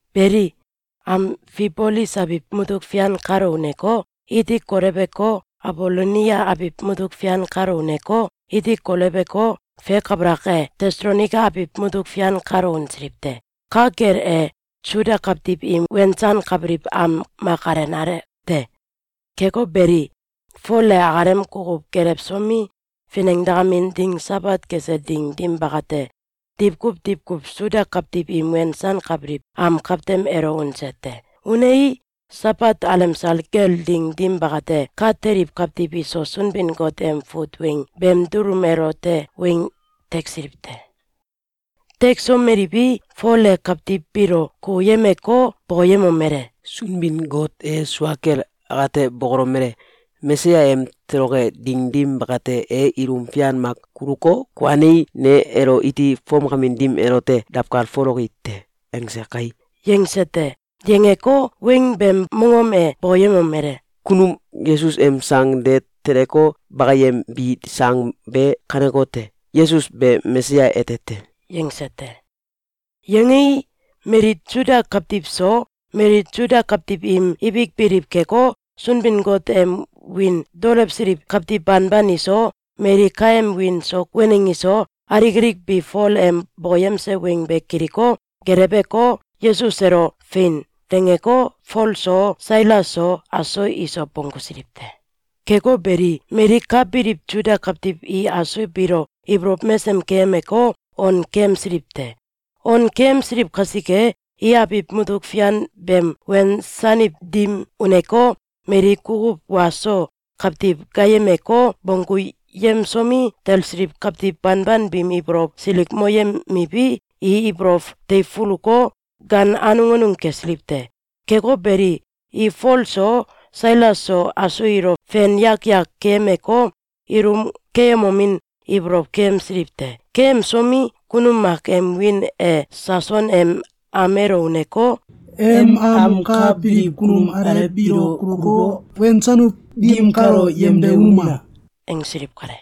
Beli, Amfibolis abiw mutuk fian kalo uneko, iti koleweko, Abolonia abiw mutuk fian kalo uneko, iti koleweko, fe kabalak e, Tesalonaika abiw mutuk fian kalo unsiliw te. Ka kel e, Suda kawtiw im wensankabiliw am mak alenale te. Keko beli, Fol e akalem kukuw gelewsomi, finengdakamin ding Sabat kese ding dim bakate, diwkuw diwkuw Suda kawtiw im wensankabiliw am kawtem elo unse te. Unei, Sabat alemsal kel ding dim bakate, ka teliw kawtiw iso Sunbin-Got em fut weng beem dulum elote weng teksiliw te. Teksomeliwi, Fol e kawtiw biilo kukuyemeko, bokoyemomele: “Sunbin-Got e sua kel akate bokolomele: ‘Mesaya em toloke ding dim bakate, e ilum fian mak kuluko, kuanei, ne elo iti fomkamin dim elote dawkalfoloki te.’, angse kai!”, yangse te. Yangeko, weng beem mongom e bokoyemomele: “Kunum Yesus em sang de teleko, bakayembi sang be kanekote: Yesus be Mesaya ete te.”, yangse te. Yangei, mali Suda kawtiw so, mali Suda kawtiw im ibik biliw keko, Sunbin-Got em wiin daolewsiliw kawtiw banban iso, mali kaem wiin so waneng iso, alik alik bi Fol em bokoyemse weng be kiliko, geleweko, Yesus elo “Fein!”, dangeko, Fol so, Sailas so, aso iso bonggusiliw te. Keko beli, mali ka biliw Suda kawtiw i aso biilo ibolow mesem keyemeko, on keyemsiliw te. On keyemsiliw kasike, i abiw mutuk fian beem wensaniw dim uneko, mali kukuw wa so kawtiw gaayemeko, bongguyemsomi, talsiliw kawtiw banban biim ibolow silikmoyemiwi, i ibolow teifuluko, gaan anung anung kesiliw te. Keko beli, i Fol so, Sailas so, aso ilo fen yak yak keyemeko, ilum keyemomin ibolow keyemsiliw te. Keyemsomi, kunum mak em wiin e Sason em am elo uneko, “Em am ka biliw kunum alew biilo kuluko, wensanuw dim kalo yemde unuma!”, angsiliw kale.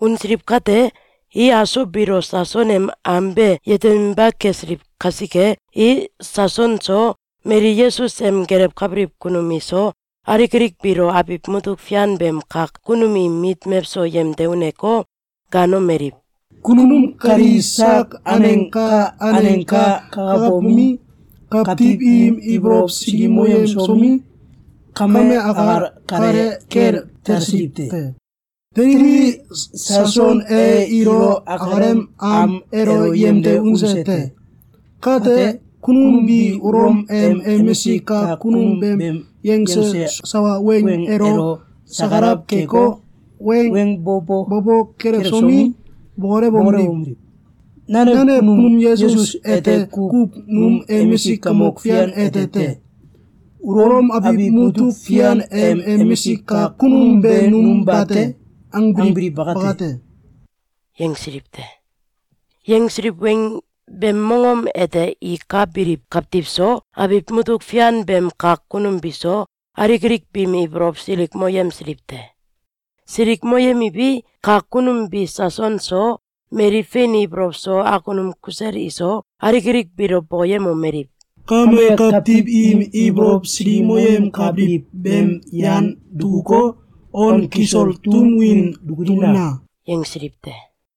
Unsiliw kate, i aso biilo Sason em am be yeteminba kesiliw kasike, i Sason so, mali Yesus em gelewkabiliw kunum iso, alik alik biilo abiw mutuk fian beem kak kunum im mit mewso yemde uneko, gaanomeliw: “Kunum kali sak aneng ka aneng ka kakabomi, kawtiw im ibolow silikmoyemsomi, kame akal kale kel talsiliw te. Teliwi, Sason e ilo akalem am elo yemde unse te. Kate, kunum bi Ulom em emisik kak kunum beem yangse sawa weng elo sakalaw keko, weng bo bo kelewsomi, bokolomeliw: ‘Nanew kunum Yesus ete kuw num emisik kamok fian ete te. Ulom abiw mutuk fian em emisik kak kunum be num bate!’, angbiliw bakate!”, yangsiliw te. Yangsiliw weng beem mongom ete i ka biliw kawtiw so, abiw mutuk fian beem kak kunum biso, alik alik biim ibolow silikmoyemsiliw te. Silikmoyemiwi, kak kunum bi Sason so, mali fein ibolow so akunum kusel iso, alik alik biilo bokoyemomeliw: “Kame kawtiw im ibolow silikmoyemkabiliw beem yan dukuko, on kisol tum win dukulina!”, yangsiliw te.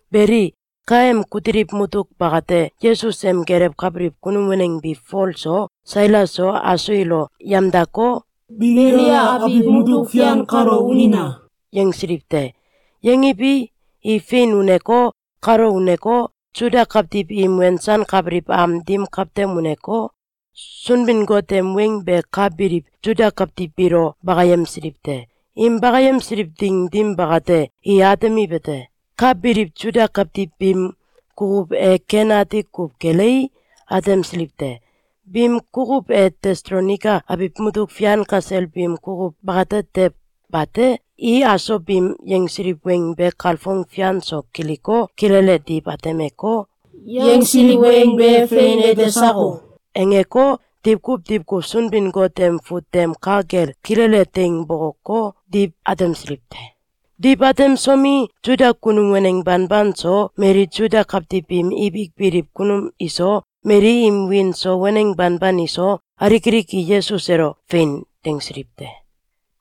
Beli, kaem kutiliw mutuk bakate, Yesus em gelewkabiliw kunum waneng bi Fol so, Sailas so, aso ilo yamdako, “Beliia abiw mutuk fian kalo unina!”, yangsiliw te. Yangiwi, i fein uneko, kalo uneko, Suda kawtiw im wensankabiliw am dim kawtem uneko, Sunbin-Got em weng be ka biliw Suda kawtiw biilo bakayemsiliw te. Im bakayemsiliw ding dim bakate, i atemiwete: Ka biliw Suda kawtiw biim kukuw e ken ati kuw kelei, atemsiliw te. Biim kukuw e Tesalonaika abiw mutuk fian kasel biim kukuw bakate tew bate. I aso biim yangsiliw weng be kalfong fian so kiliko, kilele diw atemeko, “Yangsiliw weng be fein ete sako?”, angeko, diwkuw diwkuw Sunbin-Got em fut tem ka kel kilele teing bokoko, diw atemsiliw te. Diw atemsomi, Suda kunum waneng banban so, mali Suda kawtiw biim ibik biliw kunum iso, mali im wiin so waneng banban iso, alik alik i Yesus elo “Fein!”, dangsiliw te.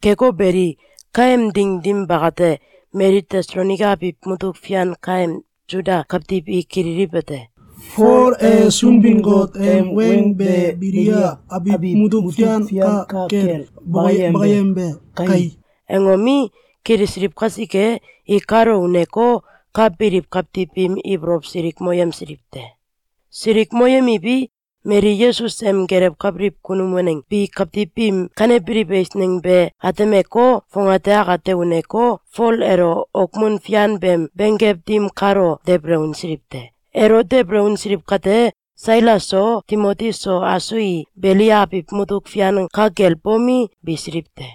Keko beli, kaem ding dim bakate, mali Tesalonaika abiw mutuk fian kaem Suda kawtiw i kililiwete: “Fol e Sunbin-Got em weng be Beliia abiw mutuk fian ka kel bakayembe kai!”, angomi, kilisiliw kasike, i kalo uneko, ka biliw kawtiw biim ibolow silikmoyemsiliw te. Silikmoyemiwi, mali Yesus em gelewkabiliw kunum waneng bi kawtiw biim kanebiliw eisneng be atemeko, fongate akate uneko, Fol elo okmun fian beem benggew dim kalo debele unsiliw te. Elo debele unsiliw kate, Sailas so, Timoti so, aso i Beliia abiw mutuk fian ka kel bomi, bisiliw te.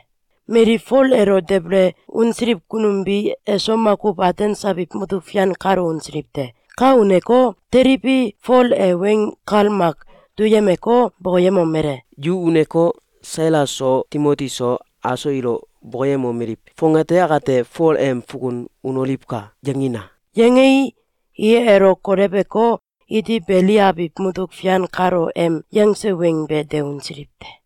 Mali Fol elo debele unsiliw kunum bi eso makuw Atens abiw mutuk fian kalo unsiliw te. Ka uneko, teliwi, Fol e weng kal mak duyemeko, bokoyemomele: “Yu uneko, Sailas so, Timoti so, aso ilo bokoyemomeliw: ‘Fongate akate Fol em fukun unoliwka!’, yangina!”, yangei, i elo koleweko, iti Beliia abiw mutuk fian kalo em yangse weng be de unsiliw te.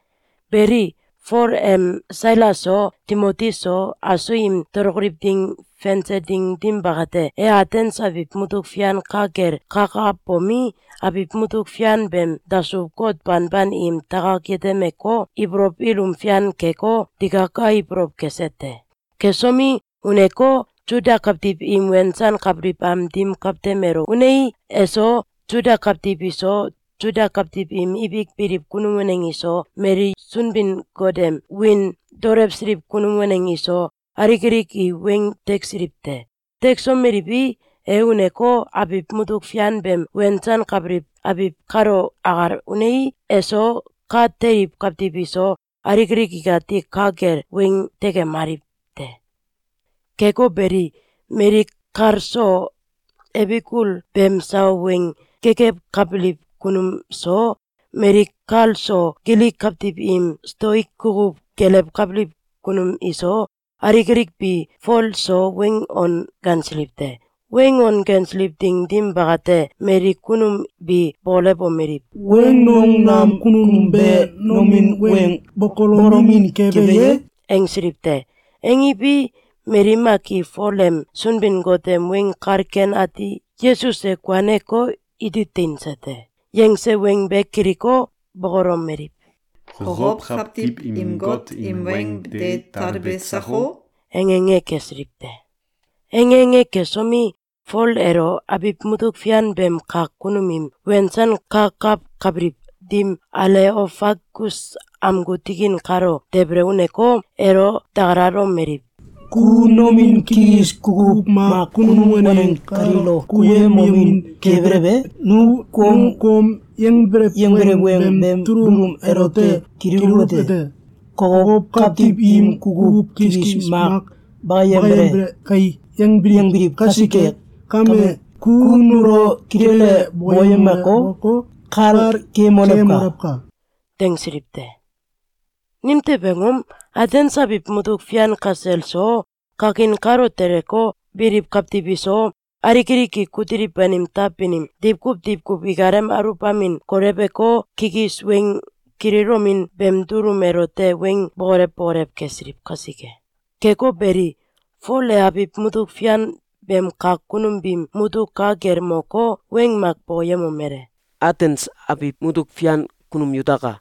Beli, Fol em Sailas so, Timoti so, aso im tolokoliw ding fense ding dim bakate, e Atens abiw mutuk fian ka kel kakabomi, abiw mutuk fian beem dasuw-got banban im takak yetemeko, ibolow ilum fian keko, digaka ibolow kese te. Kesomi, uneko, Suda kawtiw im wensankabiliw am dim kawtem elo unei, eso, Suda kawtiw iso, Suda kawtiw im ibik biliw kunum waneng iso, mali Sunbin-Got em wiin daolewsiliw kunum waneng iso, alik alik i weng teksiliw te. Teksomeliwi, e uneko, abiw mutuk fian beem wensankabiliw abiw kalo akal unei, eso, ka teliw kawtiw iso, alik alik ikati ka kel weng tekemaliw te. Keko beli, mali kal so Ebikul beem sawa weng gekewkabiliw kunum so, mali kal so Gilik kawtiw im Stoik kukuw gelewkabiliw kunum iso, alik alik bi Fol so weng on gansiliw te. Weng on gansiliw ding dim bakate, mali kunum bi bokolewomeliw: “Weng nong nam kunum be nomin weng bokolomin kebe ye?”, angsiliw te. Angiwi, mali mak i Fol em Sunbin-Got em Weng Kal Ken Ati “Yesus e kuaneko, iti teinse te!”, yangse weng be kiliko, bokolomeliw: “Kokow kawtiw im got im weng de talbe sako?”, ange ange kesiliw te. Ange ange kesomi, Fol elo abiw mutuk fian beem kak kunum im wensankakawkabiliw dim Aleofagus amgu tikin kalo debele uneko, elo dakalalomeliw: “Ku nomin kikis kukuw mak kunum waneng kaliilo kukuyemomin kebelew e? Nu kom yangbelew weng beem dulum elote kililuwete: ‘Kokow kawtiw im kukuw kikis mak bakayembele kai!’, yangbiliw kasike kame, ku nulo kilele bokoyemeko, kal keyemolewka!”, dangsiliw te. Nimtew angom? Atens abiw mutuk fian kasel so, kakin kalo teleko, biliw kawtiw iso, alik alik i kutiliw banim taw banim diwkuw diwkuw ikalem aluwbamin koleweko, kikis weng kililomin beem dulum elote weng bokolew bokolew kesiliw kasike. Keko beli, Fol e abiw mutuk fian beem kak kunum biim mutuk ka kel moko, weng mak bokoyemomele: “Atens abiw mutuk fian kunum yutaka!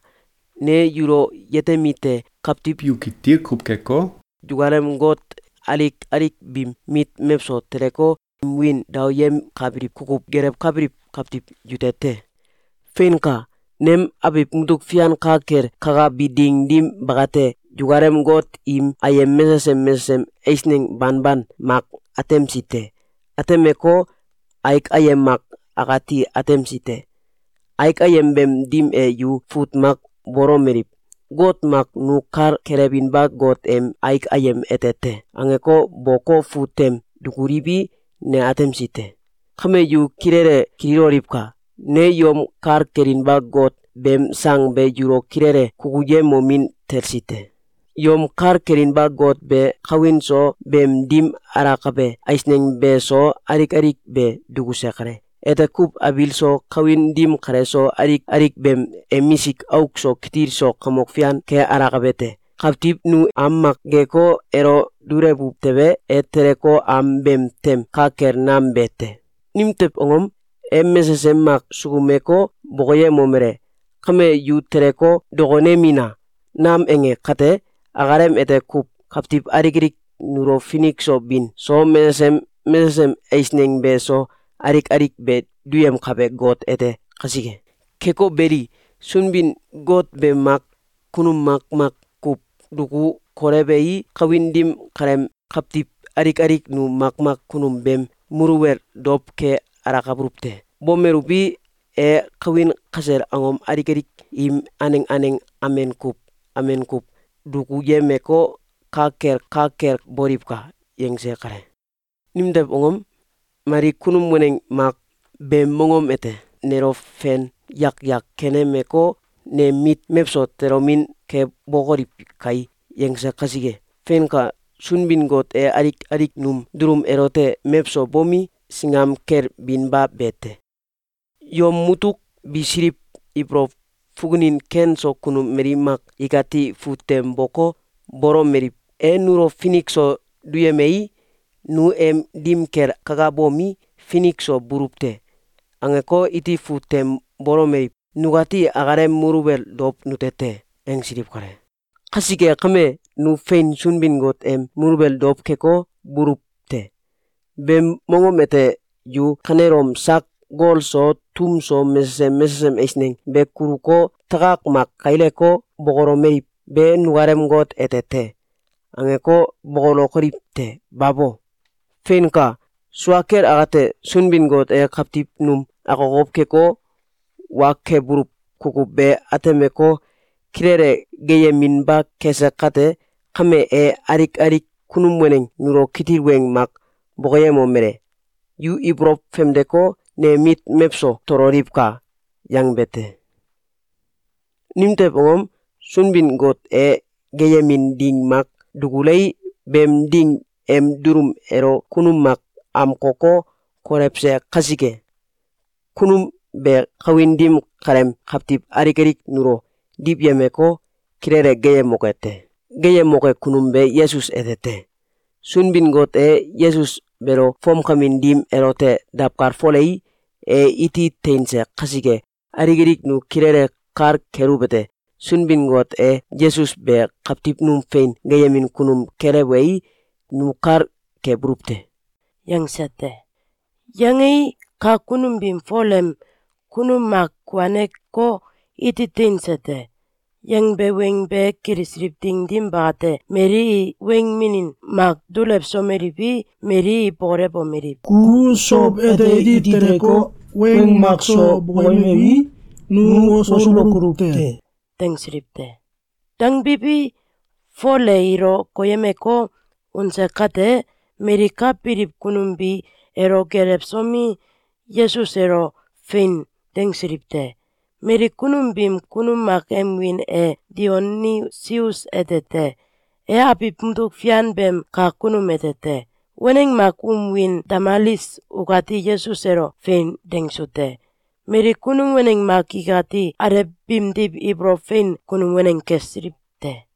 Ne yulo yetemite: Kawtiw yu kitil kuw keko, yukalem got alik alik biim mit mewso teleko, im wiin daoyemkabiliw kukuw gelewkabiliw kawtiw yute te. Feinka! Nem abiw mutuk fian ka kel kakabi ding dim bakate, yukalem got im ayem mesesem mesesem eisneng banban mak atemsi te. Atemeko, aik ayem mak akati atemsi te. Aik ayem beem dim e yu fut mak bolomeliw: ‘Got Mak Nu Kal Kelewinba Got em Aik Ayem ete te.’, angeko, boko, fut tem dukuliwi, ne atemsi te. Kame yu kilele kililoliwka! Ne yom kal kelinba Got beem sang be yulo kilele kukuyemomin talsi te. Yom kal kelinba Got be kawin so, beem dim alakabe eisneng be so, alik alik be dukuse kale. Ete kuw abiil so, kawin dim kale so, alik alik beem emisik auk so kitil so kamok fian ke alakabe te. Kawtiw nu am mak geeko, elo dulewuw tewe, e teleko, am beem tem ka kel nam be te. Nimtew angom? E mesesem mak sukumeko, bokoyemomele: ‘Kame, yu teleko, dokonemina!’, nam ange kate, akalem ete kuw kawtiw alik alik nulo finik so bin so, mesesem mesesem eisneng be so, alik alik be duyemkabe Got ete kasike. Keko beli, Got be mak kunum makmak kuw duku kolewei, kawin dim kaleem kawtiw alik alik nu makmak kunum beem muluwel dow ke alakabuluw te. Bomeluwi, e kawin kasel angom alik alik im aneng aneng amen kuw amen kuw dukuyemeko, ‘Ka kel, ka kel boliwka!’, yangse kale. Nimtew angom? ‘Mali kunum waneng mak beem monom ete nelo fen yak yak kenemeko, nem mit mewso tolomin kebokoliw kai!’, yangse kasike. Feinka! Sunbin-Got e alik alik num dulum elote mewso bomi, singam kel binba be te! Yom mutuk bisiliw ibolow fukunin ken so kunum mali mak ikati fut tem boko, bolomeliw: ‘E nulo finik so duyemei, nu em dim kel kakabomi, finik so buluw te.’, angeko, iti fut tem bolomeliw: ‘Nukati akalem muluwel dow nute te.’, angsiliw kale. Kasike kame, nu fein Sunbin-Got em muluwel dow keko, buluw te. Beem mongom ete yu kanelom sak gol so, tum so, mesesem mesesem eisneng be kuluko, takak mak kaileko, bokolomeliw: ‘Be nukalem Got ete te!’, angeko, bokolokoliw te! Babo! Feinka! Sua kel akate, Sunbin-Got e kawtiw num akokow keko, wa kebuluw kukuw be atemeko, kilele geeyeminba kese kate kame, e alik alik kunum waneng nulo kitil weng mak bokoyemomele: ‘Yu ibolow famdeko, nem mit mewso tololiwka!’, yangbe te. Nimtew angom? Sunbin-Got e geeyemin ding mak dukulei, beem ding em dulum elo kunum mak amkoko, kolewse kasike. Kunum be kawin dim kaleem kawtiw alik alik nulo diwyemeko, kilele geeyemoke te. Geeyemoke kunum be Yesus ete te. Sunbin-Got e Yesus beelo fomkamin dim elote dawkalfolei, e iti teinse kasike, alik alik nu kilele kal keluwete: Sunbin-Got e Yesus be kawtiw num fein geeyemin kunum kelewei, nu kal kebuluw te.”, yangse te. Yangei, kak kunum biim Fol em “Kunum mak kuaneko, iti teinse te!”, yangbe weng be kilisiliw ding dim bakate, mali i weng minin mak dulewsomeliwi, mali i bokolewomeliw: “Ku sow ete iti teleko, weng makso bokoyemewi, nu wosulokoluw te!”, dangsiliw te. Dangbiwi, Fol e ilo koyemeko, unse kate, mali ka biliw kunum bi elo gelewsomi, Yesus elo “Fein!”, dangsiliw te. Mali kunum biim kunum mak em wiin e Dionisius ete te. E abiw mutuk fian beem kak kunum ete te. Waneng mak um wiin Damalis ukati Yesus elo “Fein!”, dangsu te. Mali kunum waneng mak ikati alew biimdiw ibolow fein kunum waneng kesiliw te.